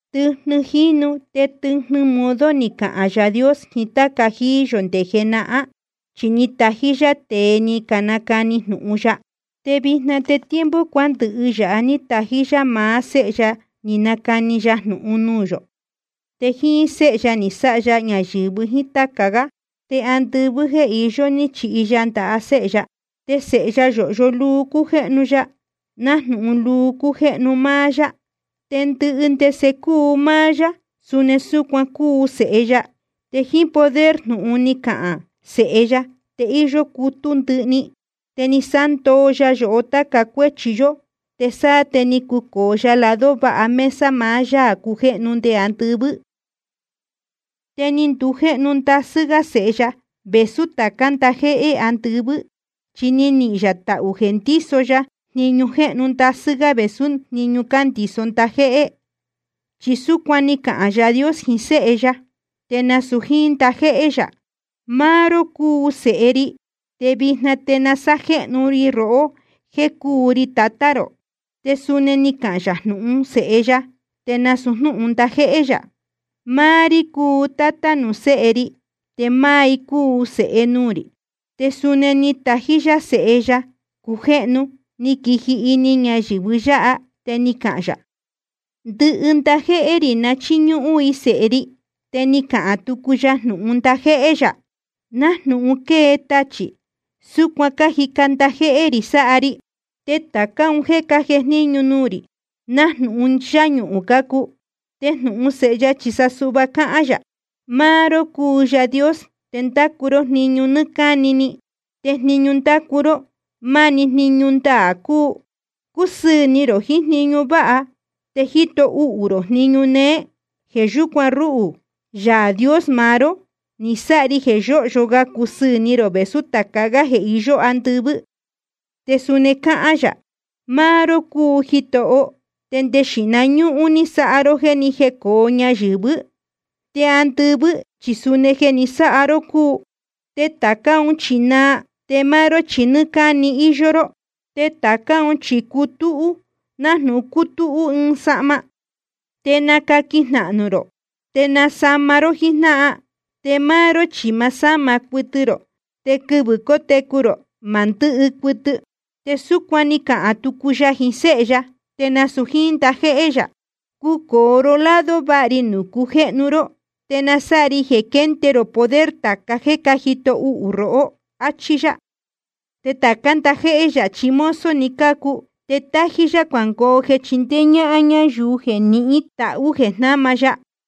Tɨjnɨ jínu te tɨjnɨ modo ni cahān Yaā Dios jiín táca jíí yō nde jenahán, chi ni tají yá tēe ni canacani jnūhun ya. Te vijna te tiempo cuándɨhɨ yāha ní tají yá maá Séhe ya ni nacani ya jnūhun nuū yō. Te jíín Séhe ya ni sáha ya ñayɨ̄vɨ jíín táca gá, te ndɨvii jeē iyó ní chihi ya ndaha Séhe ya. Te Sēhe ya yōhyo luu cújéhnu ya, nájnūhun luu cújéhnu máá yá. Te ndɨhɨ ndese cúu máá yá, suni súcuan cúu Sēhe ya. Te jíín poder jnūhun ni cahān Sēhe ya te íyó cutú ndɨhɨ‑ni. Te ni sándoo ya yohó táca cuéchi yó, te sáá te ni cucōo ya lado váha mesa maá Yaā cujéhnu nde andɨvɨ́. Te ni ndujéhnu ndasɨ́ gá Sēhe ya vēsú tācá ndajéhé andɨvɨ́, chi ni nihīn yā tahū jeē ndíso ya jniñu jéhnu ndasɨ́ gá vēsú jniñu cándiso ndajéhé. Chi súcuan ni cahān Yaā Dios jiín Séhe ya, te nasūu jíín ndajéhé yā: Máá ró cúu Sēhe ri, te vijna te ni sajéhnu ri rohó jéē cúu ri Tatá rō. Te suni ni cahān yā jnūhun Séhe ya, te nasūu jnúhun ndajéhé yā: Máá rí cúu Tátá nuū Séhe ri, te máá i cúu Sēhe nuū rī. Te suni ná ni tají yá Sēhe ya cujéhnu, ni quiji ini ñayɨ̄vɨ yáha, te ni cahān yā: Ndɨhɨ ndajéhé rī na chíñúhún i Sēhe ri. Te ni cahān tucu ya jnūhun ndajéhé yā: Nájnūhun quée tachī, súcuan cájica ndajéhé rī sáha ri, te tācá un jéē cájejníñu nuū rī, nájnūhun yáñuhūn cácuu. Te jnūhun Sēhe ya chi sa suhva cáhán yā: Máá ró cúu Yaā Dios, te ndacu ró jniñu nɨ́ɨ́ cáni, te jniñu ndácu ró, máni jniñu ndaā cúu. Cúsɨɨ̄ ni rō jiín jniñu váha, te jíto uhū rō jniñu néé. Jeē yúcuan ruhū, Yaā Dios maá ró, ni sáha ri jeē yóhyo ga cúsɨɨ̄ ni rō vēsú tāca gá jeē iyó andɨvɨ́. Te suni cáhán yā: Máá ró cúu Jitoho, te nde xīhna ñúhún ni sáha ró jéē ni jécōo ñayɨ̄vɨ́. Te andɨvɨ́ chi suni jeē ni sáha ró cúu. Te tācá un chi naa, te máá ró chi nɨ́ɨ́ cáni íyó ró. Te tācá un chi cutúhú nájnūhun cútúhú ɨɨn sahma, te nacaquin jnahnū rō te nasama ró jíjnáhan. Te máá ró chi ma sáma cuɨtɨ rō, te quɨvɨ̄ cótecu rō ma ndɨ́hɨ cuɨtɨ. Te súcuan ni cahān tucu yā jiín Séhe ya, te nasūu jíín ndajéhé yā: Cucōo ró lado váha ri nuū cujéhnu ró, te na sáha ri jeē quende rō poder tāca jéē cájito uhū rohó. Achí yá. Te tācá ndajéhé yā chi mozo‑ni cácuu, te tájí yá cuangoo jeē chindéé ñáhán ñáyuu jeē nihín tahū jeē jnama ya.